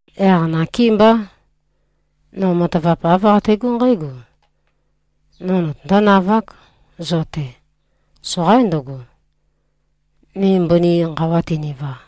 Yaq nakémbá, no matavap āv qategó nqǽgo: No notøndó-navák, zo-te. Soqaín ndøgo, ni mbøni nqawa tøniva.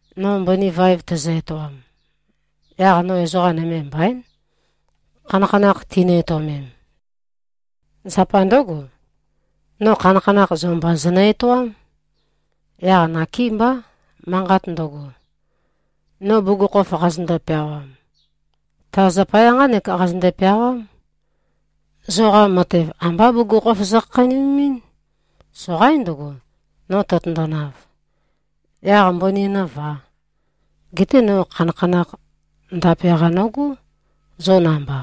No mbøni vaev tæzø-etoam, yaq no ezoqa nøme mbaín, khanakhanakh tinø-etøomem. Zapa ndǿgo, no khanakhanakh zo mba zønø-etoám. Yaq nakémbá. Manqat ndøgo, no bugukhokhof qazøndo-peawam, ta zapaya nqánek qazønde-peawám: Zoqa matev ambá bugukhokhof zokhakheinømemɨ́n. Soqaín ndøgo, no tøtøndonav, yaq mbøni nǿvā. Geté no khanakhanakh ndape-qa nogó, zo namba.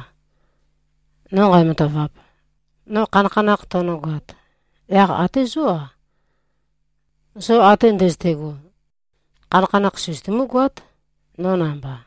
No nqæmatavap, no khanakhanakh tønøgoat, yaq até zó-a, zo ate ndøzøte꞉go, khanakhanakh søzøtumú-goát, no namba.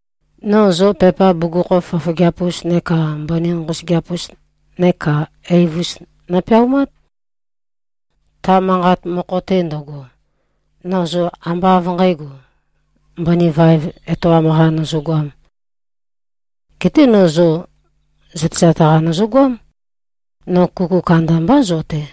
No zo pepa bugukhokhof fofogeap-us neka mbøni nqosøgeap-us neka eiv-us nopeaumát. Ta manqat mokho-te ndøgo, no zo ambá av nqǣgo, mbøni vaev etoam-qa nøzøgoām. Geté no zo zøtezat-qa nøzøgoám, no kuku kandambá zo-te.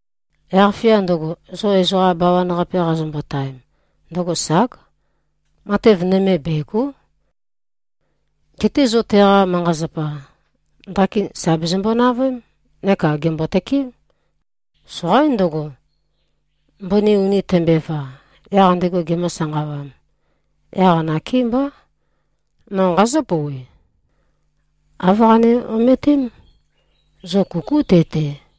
Yaq-fia ndøgo, zo ezoqa bawan-qape qazombotaem, ndøgo ság. Matev nøme, bègo᷄. Geté zo teqa manqa-zapa, ndakin sà bezømbo-navøém. Neka gèmbo-tøkeém. Soqaín ndøgo, mbøni uni tømbøeva, yaq ndego gemø̄-sanqawām. Yaq nakémbá, no nqazǿ-pouwe: Āv qane-ometém: Zo kukú te-te.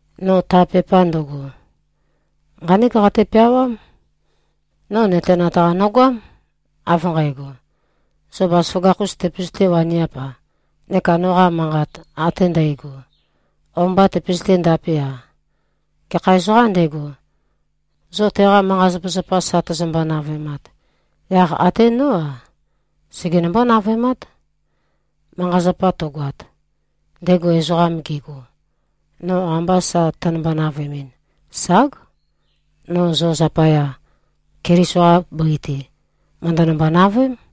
No ta pepa ndøgo, nqánek qate-peawám: No nøtenat-qa nøgoám, av nqægo, zo bazaføgakh-us tøpøzøté-waniap-a, neka noqa manqat ate ndægo, o-mba tøpøzøté-ndape-a. Gekha ezoqām ndego, zo teqa manqa-zapazapa, sa tøzømbo-navøemat, yaq até nó-a, segenømbó-navøemát. Manqa-zapa tøgoat, ndego ezoqam gego, no amba sa tønømbo-navøemɨn, ság, no zo zapaya, Keliso-qa bøi-te, mø̀ndønømbo-navøém.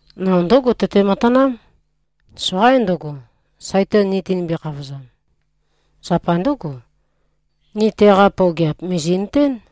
No ndǿgo, tøté-matanám. Soqaín ndøgo, Saitan ni tinimbi-khavozam. Zapa ndǿgo, ni teqa pøogeap, mìzi꞉nøtén.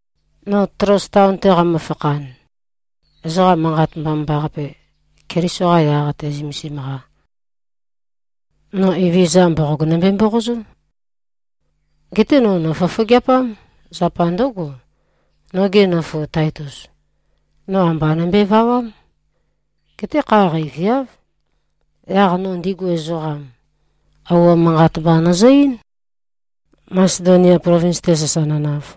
No Tloas taon-te qæmø-fakhan, ezoqa Manqat Mbomambaqape, Keliso-qa yaq-te zømesim-qa, no Evezøza mboqog nømbe-mboqozó. Geté no nòfofogeapám. Zapa ndǿgo, noge nøfu Taitus, no amba nømbøe-vawám. Geté kha qeiviáv. Yaq no ndigu ezoqam, ouo manqat mba nøzø-eín, Masedonia plovins-te sasa nønav.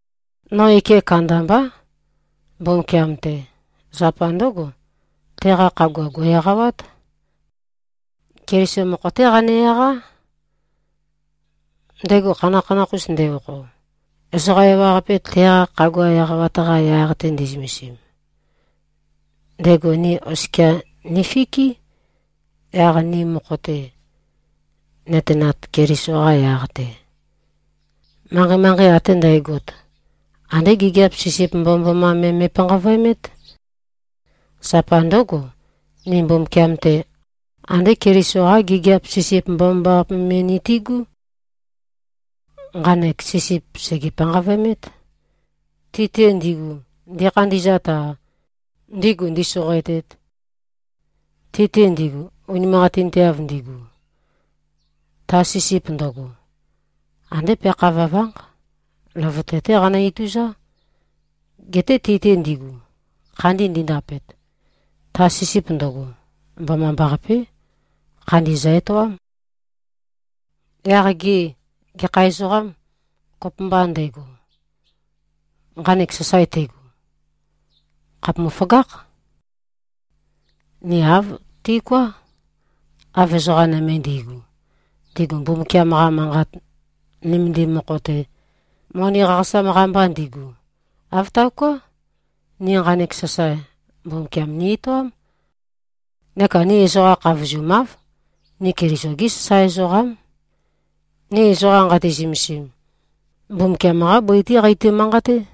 No ike kandambá, Mbumbukiam-te. Zapa ndǿgo, teqa khagua gò꞉-eqawát. Keliso mokho-té qane-eqá. Ndego khanakhanakh-us nde-okho, ezoqa ewaqape teqa khagua eqawat-qa yaq-te nde꞉zømesim, ndego ni oskia nifikí. Yaq ni mokho-te, nøtenat Keliso-qa yaq-te, manqei-manqei ate ndægot, andé gigiap sisip mbomambaqape me me꞉panqavøemét. Zapa ndǿgo, ni Mbumbukiam-te, andé Keliso-qá gigiap sisip mbomambaqape me nitigú. Nqanek sisip sège-panqavøemét, ti-te ndigu, ndikhandi꞉zat-a, ndigu ndīsōqōētēt. Ti-te ndigu, unimanqatinteav ndigu, ta sisip ndøgo, andé peakha vøvánq. Løvøte-té qanø-ituzá. Geté ti-te ndigu, khandi ndindapet, ta sisip ndøgo, mbomambaqapé. Khandi zø-etoám. Yaq gê, gekha ezoqâm, kopømba ndego, nqanek sasae tego? Khàpumu-føgákh. Ni āv tiuká, av ezoqa nøme ndi꞉gu, ndigu Mbumbukiam-qa Manqat nømendim mokho-te, moni qaqasam-qa mba ndigu. Āv taoká. Ni nqanek sasae, Mbumbukiam ni-etoám. Neka ni ezoqa khavozumáv. Ni Keliso-gí sasae ezoqám. Ni ezoqa nqati-zømesim, Mbumbukiam-qá bøi-té qeito-manqaté.